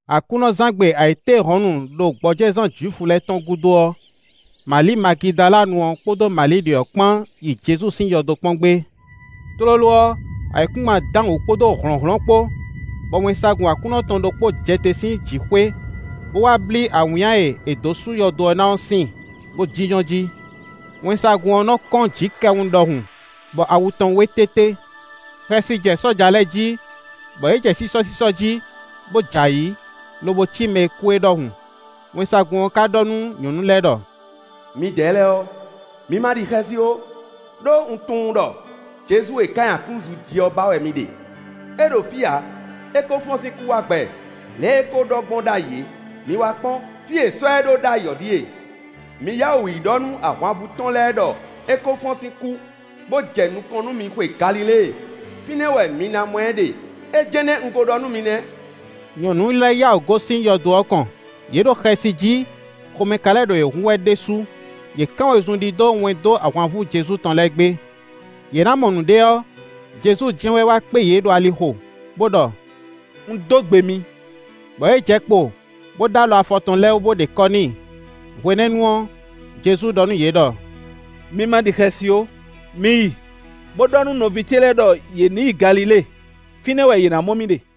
Aklúnɔzán gbe ayǐtéhɔ̌nnu ɖo gbɔjɛzán Jwifu lɛ́ɛ tɔn gúdo ɔ́, Mali Magidalanu ɔ́ kpódó Mali ɖě ɔ́ kpán yi Jezu sín yɔdo kpɔ́n gbé. Tlóló ɔ́, ayǐkúngban dán wǔ kpódó hlɔ̌nhlɔ́n kpó; bɔ wɛnsagun Aklúnɔ tɔn ɖokpó jɛ te sín jǐxwé, bó wá blí awǐnnya e è dǒ sú yɔdo ɔ́ ná ɔ́ síin, bó jínjɔ́n jí. Wɛnsagun ɔ́ nɔ́ kɔ́n jǐkɛwun ɖɔhun; bɔ awu tɔn wé tété. Xɛsi jɛ sɔ́ja lɛ́ɛ jí, bɔ yě jɛ sísɔ́sísɔ́ jí, bó jɛ ayǐ, lobo cí mɛ e kú é ɖɔhun. Wɛnsagun ɔ́ ká ɖɔ nú nyɔ̌nu lɛ́ɛ ɖɔ: “Midɛɛ lɛ́ɛ ɔ́, mi ma ɖi xɛsi ó, ɖó un tunwun ɖɔ Jezu e è ká nyi aklúzu jí ɔ́ ba wɛ mi ɖe. É ɖo fí ǎ. É ko fɔ́n sín kú wá gbɛ, lě e é ko ɖɔ gbɔn ɖ'ayǐ é. Mi wá kpɔ́n; fí e è sɔ́ ɛ ɖó ɖ'ayǐ ɔ́ ɖíe. ‘Mi yá wǔ yi ɖɔ nú ahwanvú tɔn lɛ́ɛ ɖɔ é kó fɔ́n sín kú, bó jɛ nukɔn nú mi xwe Galilée; fínɛ́ wɛ mi ná mɔ ɛ ɖe.’ É jɛ́n nɛ́ un kó ɖɔ nú mi nɛ́.” Nyɔ̌nu lɛ́ɛ yá wǔ gosín yɔdo ɔ́ kɔn; yě ɖo xɛsi jí; xomɛ ka lɛ́ ɖo yě hun wɛ ɖésú. Yě kán wezun ɖidó wɛn dó ahwanvú Jezu tɔn lɛ́ɛ gbé. Yě ná mɔ nǔɖé ɔ́, Jezu jɛ́n wɛ wá kpé yě ɖo alixo, bó ɖɔ: “Un dó gbe mi;” bɔ yě jɛ kpo, bó ɖó alɔ afɔ tɔn lɛ́ɛ wú bó ɖe kɔ́ n'i. Hwenɛ́nu ɔ́, Jezu ɖɔ nú yě ɖɔ: “Mi ma ɖi xɛsi ó. Mi yi, bó ɖɔ nú nɔví ce lɛ́ɛ ɖɔ yě ní yi Galilée; fínɛ́ wɛ yě ná mɔ mì ɖe.”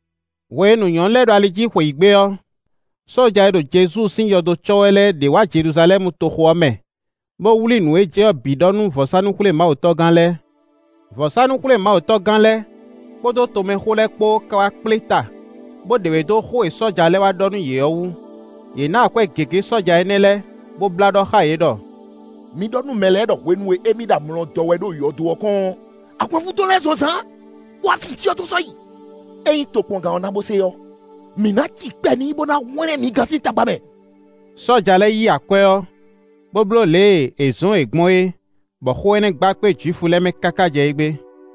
Hwenu nyɔ̌nu lɛ́ɛ ɖo ali jí xweyǐgbe ɔ́, sɔ́ja e ɖo Jezu sín yɔdo cɔ́ wɛ lɛ́ɛ ɖě wá Jeluzalɛ́mu toxo ɔ́ mɛ, bó wlí nǔ e jɛ ɔ́ bǐ ɖɔ nú vɔ̌sánú-xwlémawutɔ́gán lɛ́ɛ. Vɔ̌sánú-xwlémawutɔ́gán lɛ́ɛ kpódó tomɛxó lɛ́ɛ kpó ka wá kpléta bó ɖe wě dó xó e sɔ́ja lɛ́ɛ wá ɖɔ nú yě ɔ́ wú; yě ná akwɛ́ gěgé sɔ́ja énɛ́ lɛ́ɛ, bó blá ɖɔ xá yě ɖɔ: “Mi ɖɔ nú mɛ lɛ́ɛ ɖɔ hwenu e émí ɖo amlɔ dɔ́ wɛ ɖo yɔdo ɔ́ kɔn ɔ́, ahwanvú Jezu tɔn lɛ́ɛ zɔn zǎn bó wá fin cyɔ tɔn sɔ́ yi. Ényí tokpɔngán ɔ́ na bo se ɔ́, mǐ ná cikpɛ n'i bó ná hwlɛ́n mi gán sín tagba mɛ.” Sɔ́ja lɛ́ɛ yí akwɛ́ ɔ́, bó bló lě e è zɔ̌n yě gbɔn é, bɔ xó énɛ́ gba kpé Jwifu lɛ́ɛ mɛ káká jɛ égbé.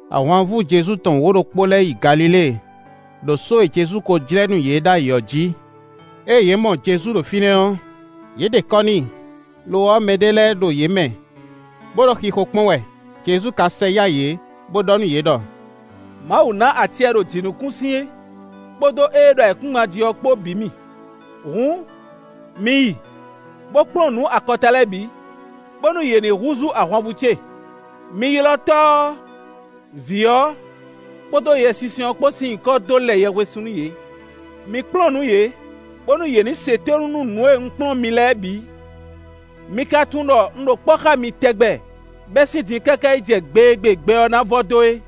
Ahwanvú Jezu tɔn wǒ-ɖokpó lɛ́ɛ yi Galilée, ɖo só e Jezu kó jlɛ́ nú yě ɖ'ayǐ ɔ́ jí. Ée yě mɔ Jezu ɖo fínɛ́ ɔ́, yě ɖe kɔ́ n'i; lo ɔ́, mɛɖé lɛ́ɛ ɖo yě mɛ, bó ɖo xixo kpɔ́n wɛ. Jezu ka sɛ yá yě, bó ɖɔ nú yě ɖɔ: “Mawu ná acɛ e ɖo jǐnukúnsin, kpódó ée ɖo ayǐkúngban jí ɔ́ kpó bǐ mì. Hǔn, mi yi bó kplɔ́n nǔ akɔta lɛ́ɛ bǐ, bónú yě ní húzú ahwanvú ce. Mi ylɔ́ Tɔ́ ɔ́, Vǐ ɔ́, kpódó Yɛsinsɛn ɔ́ kpó sín nyǐkɔ dó lɛ yɛhwesin nú yě. Mi kplɔ́n nǔ yě, bónú yě ní se tónú nú nǔ e un kplɔ́n mi lɛ́ɛ bǐ. Mi ka tunwun ɖɔ un ɖo kpɔ́ xá mi tɛgbɛ bɛ́ sín din káká yi jɛ gbe e gbe gbɛ ɔ́ ná vɔ dó é.”